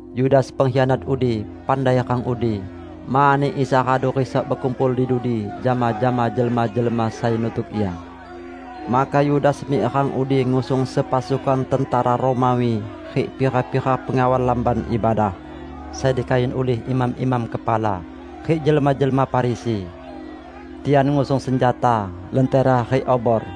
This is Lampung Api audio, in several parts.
Yudas pengkhianat udi, pandai rang udi; mani Isa radu risok bekumpul di dudi jama-jama jelma-jelma sai nutuk Ia. Maka Yudas mik rang udi ngusung sepasukan tentera Romawi rik pira-pira pengawal Lamban Ibadah sai dikayun ulih imam-imam kepala rik jelma-jelma Farisi. Tian ngusung senjata, lentera rik obor.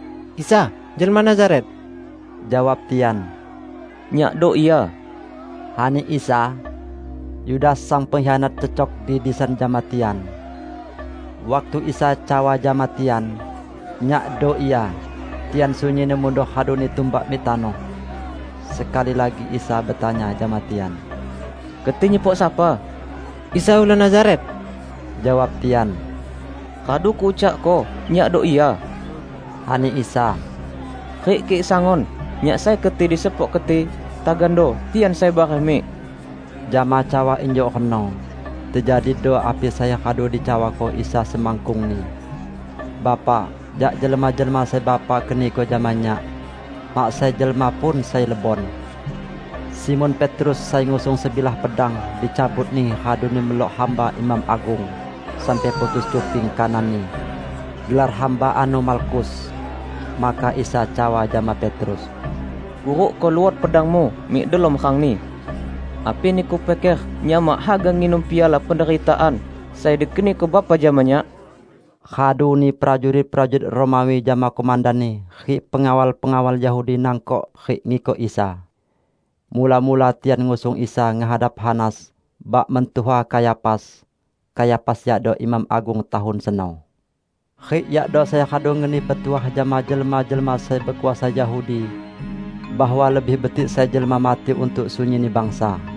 "Isa, jelma Nazaret," jawab tian. "Nyakdo Ia," ani Isa. Yudas sang pengkhianat cecok di disan jama tian. Waktu Isa cawa jama tian, "Nyakdo Ia," tian sunyinni mundor raduni tumbak mik tanoh. Sekali lagi Isa betanya jama tian, "Keti nyepok sapa?" "Isa ulun Nazaret," jawab tian. "Radu Kuucakko Nyakdo Ia," ani Isa. "Rik kik sangun Nyak sai keti disepok keti, tagando tian sai bareh mik." ( Jama cawa injuk reno, tejadido api sai radu dicawako Isa semakkungni: "Bapa, jak jelma-jelma sai Bapa keniko jama Nyak, mak sai jelma pun sai lebon.") Simon Petrus sai ngusung sebilah pedang, dicabutni raduni melok hamba imam agung sampai putus cuping kananni. Gelar hamba ano Malkus. Maka Isa cawa jama Petrus, "Kurukko luot pedangmu mik delom rangni! Api niku piker Nyak mak haga nginum piala penderitaan sai dikeniko Bapa jama Nyak?" Raduni prajurit-prajurit Romawi jama komandanni rik pengawal-pengawal Yahudi nangkok rik ngikok Isa. Mula-mula tian ngusung Isa ngehadap Hanas, bak mentuha Kayafas. Kayafas yakdo imam agung tahun seno. Rik yakdo sai radu ngeni petuah jama jelma-jelma sai bekuasa Yahudi bahwa lebih betik sai jelma mati untuk sunyinni bangsa.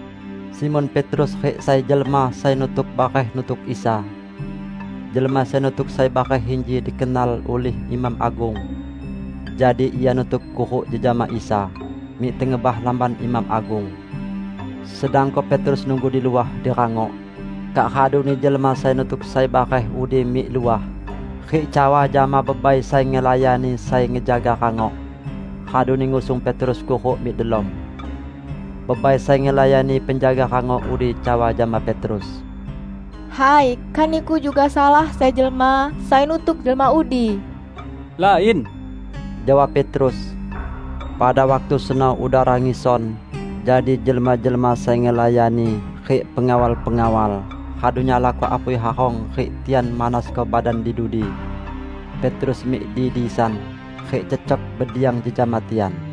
Simon Petrus rik sai jelma sai nutuk bareh nutuk Isa. Jelma sai nutuk sai bareh inji dikenal ulih imam agung; jadi ia nutuk kuruk jejama Isa mik tengebah lamban imam agung, sedangko Petrus nunggu di luah, di rangok. Kak raduni jelma sai nutuk sai bareh udi mik luah rik cawa jama bebai sai ngelayani sai ngejaga rangok, raduni ngusung Petrus kuruk mik delom. Bebai sai ngelayani penjaga rangok udi cawa jama Petrus, "Hai, kan niku juga salah sai jelma sai nutuk jelma udi?" "Lain," jawab Petrus. Pada waktu seno udara ngison, jadi jelma-jelma sai ngelayani rik pengawal-pengawal radu nyalako apui harong rik tian manasko badan di dudi. Petrus mik di disan rik cecok bediang jejama tian.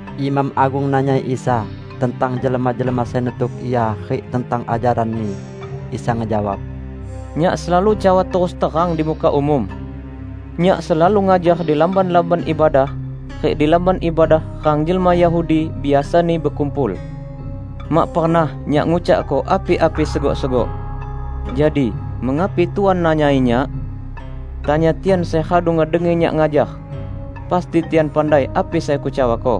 Imam agung nanyai Isa tentang jelma-jelma sai nutuk Ia rik tentang ajaran-Ni. Isa ngejawab, "Nyak selalu cawa terus terang di muka umum. Nyak selalu ngajar di lamban-lamban ibadah rik di Lamban Ibadah, rang jelma Yahudi biasani bekumpul. Mak pernah Nyak ngucakko api-api segok-segok. Jadi mengapi Tuan nanyai Nyak? Tanya tian sai radu ngedengi Nyak ngajar. Pasti tian pandai api sai Kucawako."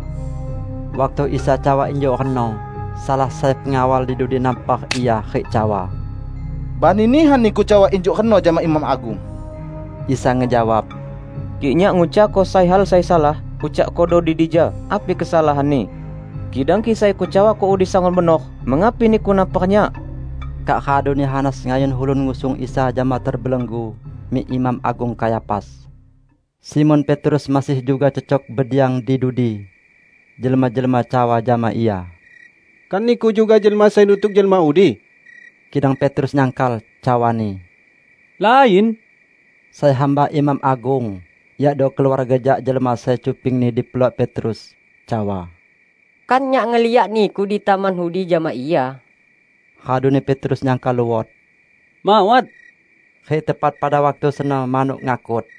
Waktu Isa cawa injuk reno, salah sai pengawal di dudi nampar Ia rik cawa, "Bani nihan Niku cawa injuk reno jama imam agung!" Isa ngejawab, "Kik Nyak ngucakko sai hal sai salah, ucakkodo di dija api kesalahanni! Kidang kik sai Kucawako udi sangun benor, mengapi niku nampar Nyak?" Kak raduni Hanas ngayun ulun ngusung Isa jama terbelenggu mik Imam Agung Kayafas. Simon Petrus masih juga cecok bediang di dudi. Jelma-jelma cawa jama ia, "Kan niku juga jelma sai nutuk jelma udi?" Kidang Petrus nyangkal, cawani, "Lain!" Sai hamba imam agung, yakdo keluarga jak jelma sai cupingni dipelok Petrus, cawa, "Kan nyak ngeliak niku di taman udi jama Ia?" Raduni Petrus nyangkal luot, "Mawat," -- rik tepat pada waktu seno manuk ngakut.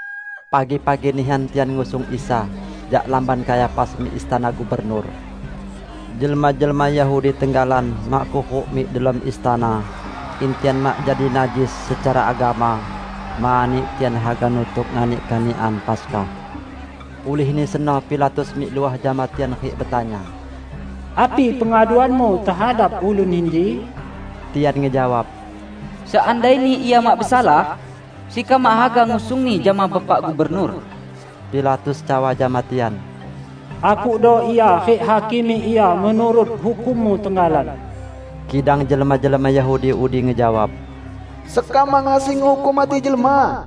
Pagi-pagi nihan tian ngusung Isa jak lamban Kayafas mik istana gubernur. Jelma-jelma Yahudi tenggalan mak kuruk mik delom istana, in tian mak jadi najis secara agama, mani tian haga nutuk nganik kanikan Paskah. Ulihni seno Pilatus mik luah jama tian rik betanya, "Api pengaduanmu tehadap ulun inji?" Tian ngejawab, "Seandaini Ia mak besalah, sekam mak haga ngusung-Ni jama Bapak Gubernur." Pilatus cawa jama tian, "Akukdo Ia rik hakimi Ia menurut hukummu tenggalan!" Kidang jelma-jelma Yahudi udi ngejawab, "Sekam mak ngasi ngehukum mati jelma." (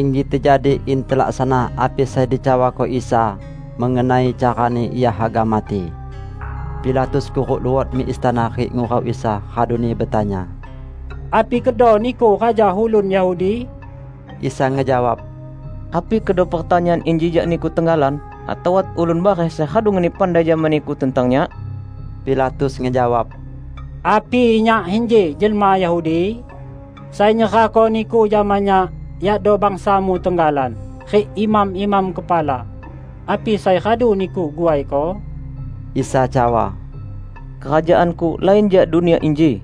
Inji tejadi in telaksana api sai dicawako Isa mengenai carani Ia haga mati.) Pilatus kuruk luot mik istana rik ngurau Isa, raduni betanya, "Api kedo Niku raja ulun Yahudi?" Isa ngejawab, "Api kedo pertanyaan inji jak niku tenggalan atau wat ulun bareh sai radu ngeni pandai jama niku tentang Nyak?" Pilatus ngejawab, "Api nyak inji jelma Yahudi? Sai nyerahko Niku jama nyak iado bangsa-Mu tenggalan rik imam-imam kepala. Api sai radu Niku guaiko?" Isa cawa, "Kerajaan-Ku lain jak dunia inji.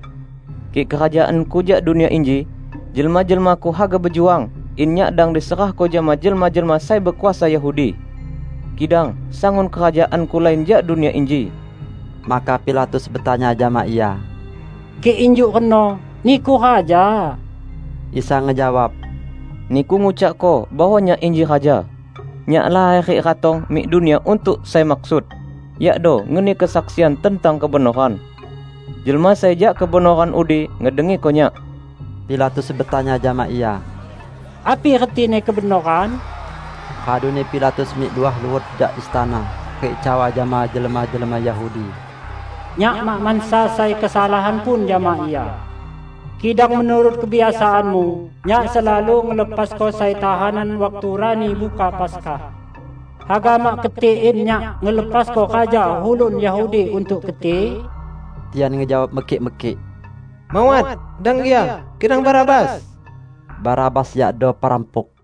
Kik kerajaan-Ku jak dunia inji, jelma-jelma-Ku haga bejuang in Nyak dang diserahko jama jelma-jelma sai bekuasa Yahudi. Kidang sangun kerajaan-Ku lain jak dunia inji!" Maka Pilatus betanya jama Ia, "Kik injuk reno, Niku raja?" Isa ngejawab, "Niku ngucakko bahwa Nyak inji raja. Nyak laher rik ratong mik dunia untuk sai maksud, yakdo ngeni kesaksian tentang kebenoran. Jelma sai jak kebenoran udi ngedengiko Nyak." Pilatus betanya jama Ia, "Api retini kebenoran?" Raduni Pilatus mik luah luot jak istana rik cawa jama jelma-jelma Yahudi, "Nyak mak mansa sai kesalahan pun jama Ia. Kidang menurut kebiasaanmu, nyak selalu ngelepasko sai tahanan waktu Rani Buka Paskah. Haga mak keti in nyak ngelepasko raja ulun Yahudi untuk keti?" Tian ngejawab mekik-mekik, "Mawat, dang Ia, kidang Barabas!" (Barabas yakdo perampuk.)